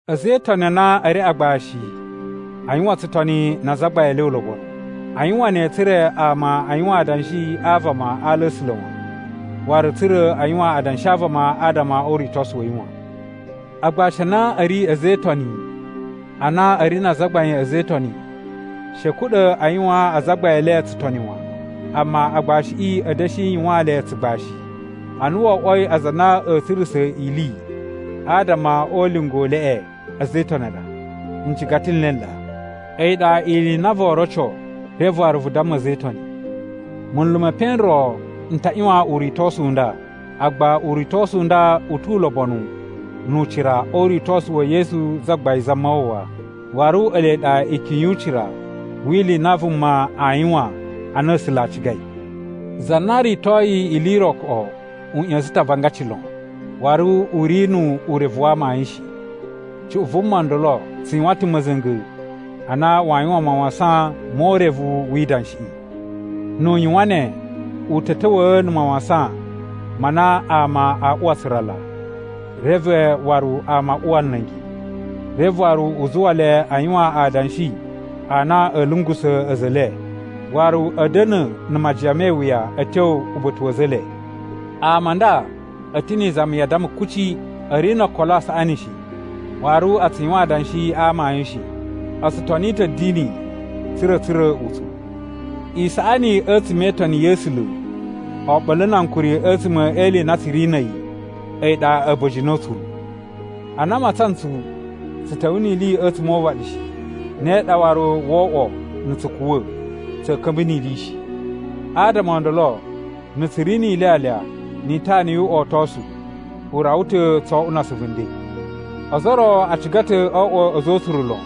A̱za̱ e Itoni a na a̱ ri agbashi a yuwan tsutoni na azagbain e le ulobonu. A yuwan ne tsa̱ra̱ ama a yuwan adanshi a vama ala a̱ A̱sula̱ wan, waru tsa̱ra̱ a yuwan adanshi a vama adama o uritosu wa̱ yi wan. Agbashi a na a̱ ri a̱za̱ e Itoni a na a̱ ri na azagbain a̱za̱ e Itoni, she a̱ kuɗa̱ a yuwaan azagbain e le tsutoni wan. Amma, agbashiꞌi a̱ da̱shi yuwaan le tsugbashi, a na wo oꞌwoi aza a na a̱a̱ tsurusa̱ ili adama o ulinga u leꞌe a̱za̱ e Itoni a ɗa, ncigata n le n ɗa. A̱yi ɗa ili i na voo roco, reve waru vu damma a̱za̱ e Itoni. Munlu me epen n ro n ta ꞌyuwan uritosu u nda, agba uritosu u nda u tu ulobonu nu ucira o uritosu wa̱ Yesu Zagbain Zamawawa, waru ele ɗa ikyun yu ucira wi ili i na vuma aa yuwan a na A̱sula̱ a cigai. Za na ritoyi ili i ro koꞌo u ꞌya̱sa̱n ta̱ avangaci lon. Waru u ri nu urevu wa amayun shi. Cuꞌun vuma ndolo tsu yuwan ta̱ ma̱za̱nga̱ a na waa yuwan mawasan mo urevu wi idanshiꞌi. Nu u yuwan ne, u ta̱ ta̱wa̱a̱ na̱ mawasan ma na ama a uwa tsurala, reve waru ama a uwa nla̱ngi. Reve waru u zuwa le a yuwan adanshi a na a̱ lungusa̱ a̱za̱ e le, waru a̱ da̱na̱ na̱ majiyan me iwuya a̱ tyo uba̱ta̱ wa̱ a̱za̱ e le. Ama a nda a̱ ta̱ ni izami ya addama kuci. A̱ ri no okolo a saꞌani shi, waru a tsu yuwan adanshi a amayun shi. O tsu toni ta̱ a̱dini tsa̱ra̱ a̱ tsura̱ utsuru. Isaꞌani a̱tsuma̱ e itoni ya̱ A̱sula̱ oɓolo na ankuri a̱tsuma̱ e ili i na tsu ri na̱ a̱yi, a̱yi ɗa a̱ba̱jini o utsuru. Ana a matsan ntsu, tsu ta̱wa̱a̱ ni ili a̱tsuma̱ o uvaɗi shi. Ne ɗa waru woo oꞌwo na̱ tsu kuwa̱, tsa̱a̱ ka̱mba̱ ni ili shi. Adama o ndolo, na̱ tsu ri ni ilyalya ni itana yu uꞌotosu, u rawa ta̱ tso oꞌwo na asuvu nden. Ozo o ro a ciga ta̱ oo oꞌwo a̱za̱ o utsuru lon,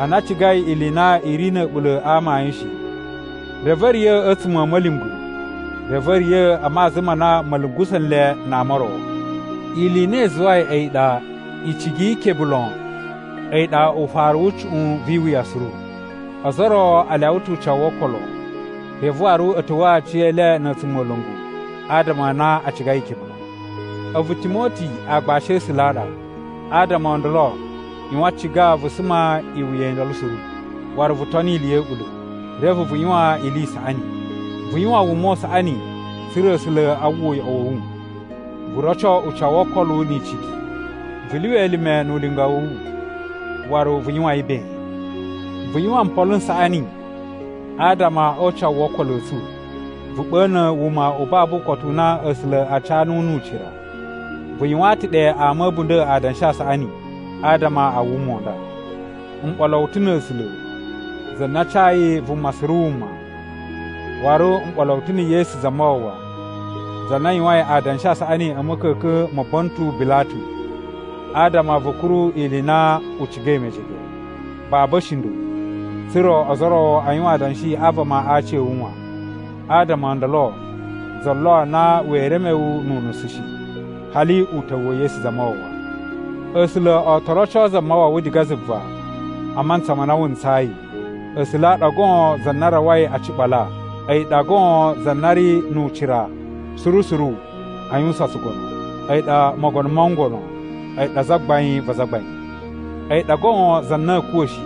ana a cigai ili i na i ri na̱ a̱ɓula̱ a amayun shi, reve a̱ riya̱ a̱tsuma̱ a̱ ma̱lyungwa̱, reve a̱ riya̱ a maza ma na ma̱ lungusa̱ nle na ama o ro. Ili i na i zuwai a̱yi ɗa, icigi yi ikebe lon a̱yi ɗa ufaru wu cuꞌun vi iwuya suru. Ozo o ro a lyawa ta̱ ucawu wo okolo, reve waru a̱ ta̱wa̱a̱ aciyele na̱ a̱tsumola̱ngu adama a na a cigai ikebe lon. A̱vu Timoti aagbashi a̱ A̱sula̱ a ɗa. Adama o ndolo ꞌyuwan ciga vu suma iwuya i ndolo suru, waru vu toni ili ya̱ a̱ɓula̱, reve vu yuwan ili i saꞌani. Vu yuwan wuma u saꞌani tsa̱ra̱ A̱sula̱ a uwwa uyoꞌo wa̱ wu. Vu roco ucawu wo okolo ni icigi. Vu lyuwa elime nu ulinga wa̱ wu, waru vu yuwan yi ben. Vu yuwan mpolo n saꞌani, adama o ucawu wo okolo a̱ tsu, vu ɓa̱na̱ wuma u babu ukotu u na A̱sula̱ a ca nuwu nu ucira. Vu yuwaan ta̱ ɗe ama a̱ a̱bunda̱ adanshi a saꞌani adama a wuma u nda. M ɓolo wu ta̱ na̱ A̱sula̱, za na cayi vuma suru wuma, waru m ɓolo wu ta̱ na̱ Yesu Zamawawa, za na yuwain adanshi a saꞌani a̱ ma̱ka̱ka̱n ma Bontu Bilatu, adama vu kuru ili i na u cigai mejege, babu a̱shinda̱, tsa̱ra̱ ozo o ro a yuwan adanshi a vama aci a̱ wu wan. Adama o ndolo za lo na wee reme wu nu unusu shi, hali uta̱wu wa̱ Yesu Zamawawa. A̱sula̱ o to roco Zamawawa diga zuva a mantsa ma na wu ntsayi. A̱sula̱ a ɗa goon za na rawai a ciɓala, a̱yi ɗa goon za na ri nu ucira suru suru a yuwusan tsugono. A̱yi ɗa Mogono mo ngono, a̱yi ɗa Zagbain va azagbain. A̱yi ɗa goon za na a̱a̱ kuwa̱ shi,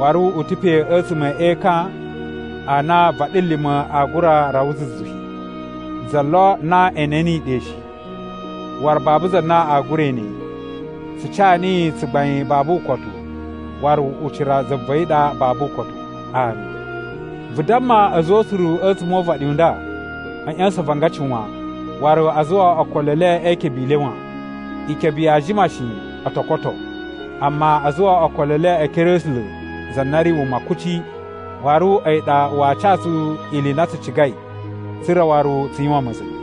waru u ta̱ pe a̱tsuma̱ e ekan a na vaɗilima̱ aa gura rawa zuzu shi. Za lo na e ene niyi ɗe shi, waru babu za na aa gura ene yi. Tsu ca niyi tsugbain babu ukotu waru ucira za va̱ yi ɗa babu ukotu. Ami. Vu damma a̱za̱ o utsuru a̱tsuma̱ o uvaɗi u nda a̱ ꞌya̱sa̱n avangaci wan, waru a zuwa okolo e le e ikebe i le wan. Ikebe yaa jima shi o to koto. Amma a zuwa okolo e le e ekere a̱ A̱sula̱ za na ri wuma kuci, waru a̱yi ɗa waa ca tsu ili i na tsu cigai tsa̱ra̱ waru tsu yuwan ma̱za̱nga̱.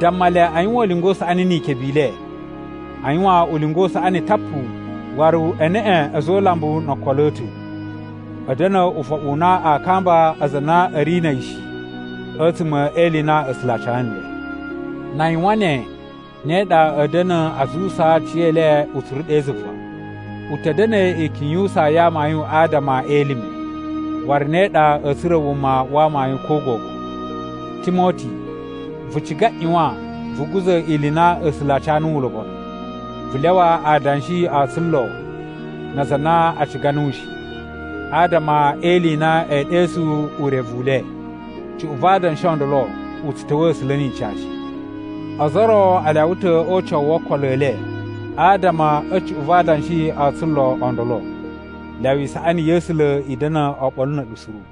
Damma le a yuwan ulinga u saꞌani ni ikebe i le. A yuwan ulinga u saꞌani tapu waru e neꞌe a̱za̱ o ulambu no okolo a̱ ta̱. A̱ da̱na̱ ufoɓu u na a kamba aza a na a̱ ri na̱ a̱yi shi a̱tsuma̱ e ili i na a̱ A̱sula̱ a ca nle. Na a yuwan ne, ne ɗa a̱ da̱na̱ a zuwusaa aciyele utsuru ɗe zuva. U ta̱ da̱na̱ ikyun yu usaa ya amayun adama e elime, waru ne ɗa a̱a̱ tsura̱ wuma wa amayun ko gogo. Timoti, vu ciga ꞌyuwan vu guza̱ ili i na A̱sula̱ a ca nuwu ulobonu. Vu lyawa adanshi o tsulo na aza a na a ciga nuwu shi, adama e ili i na ee ɗesu urevu u le. Cuꞌun va adanshi o ndolo u tsu ta̱wa̱a̱ A̱sula̱ ni ica shi. Ozo o ro a lyawa ta̱ o ucawu wo okolo e le adama a̱ cuꞌun va adanshi o tsulo o ndolo. Lyawa isaꞌani ya̱ A̱sula̱ i da̱na̱ oɓolo na̱ a̱ɗu suru.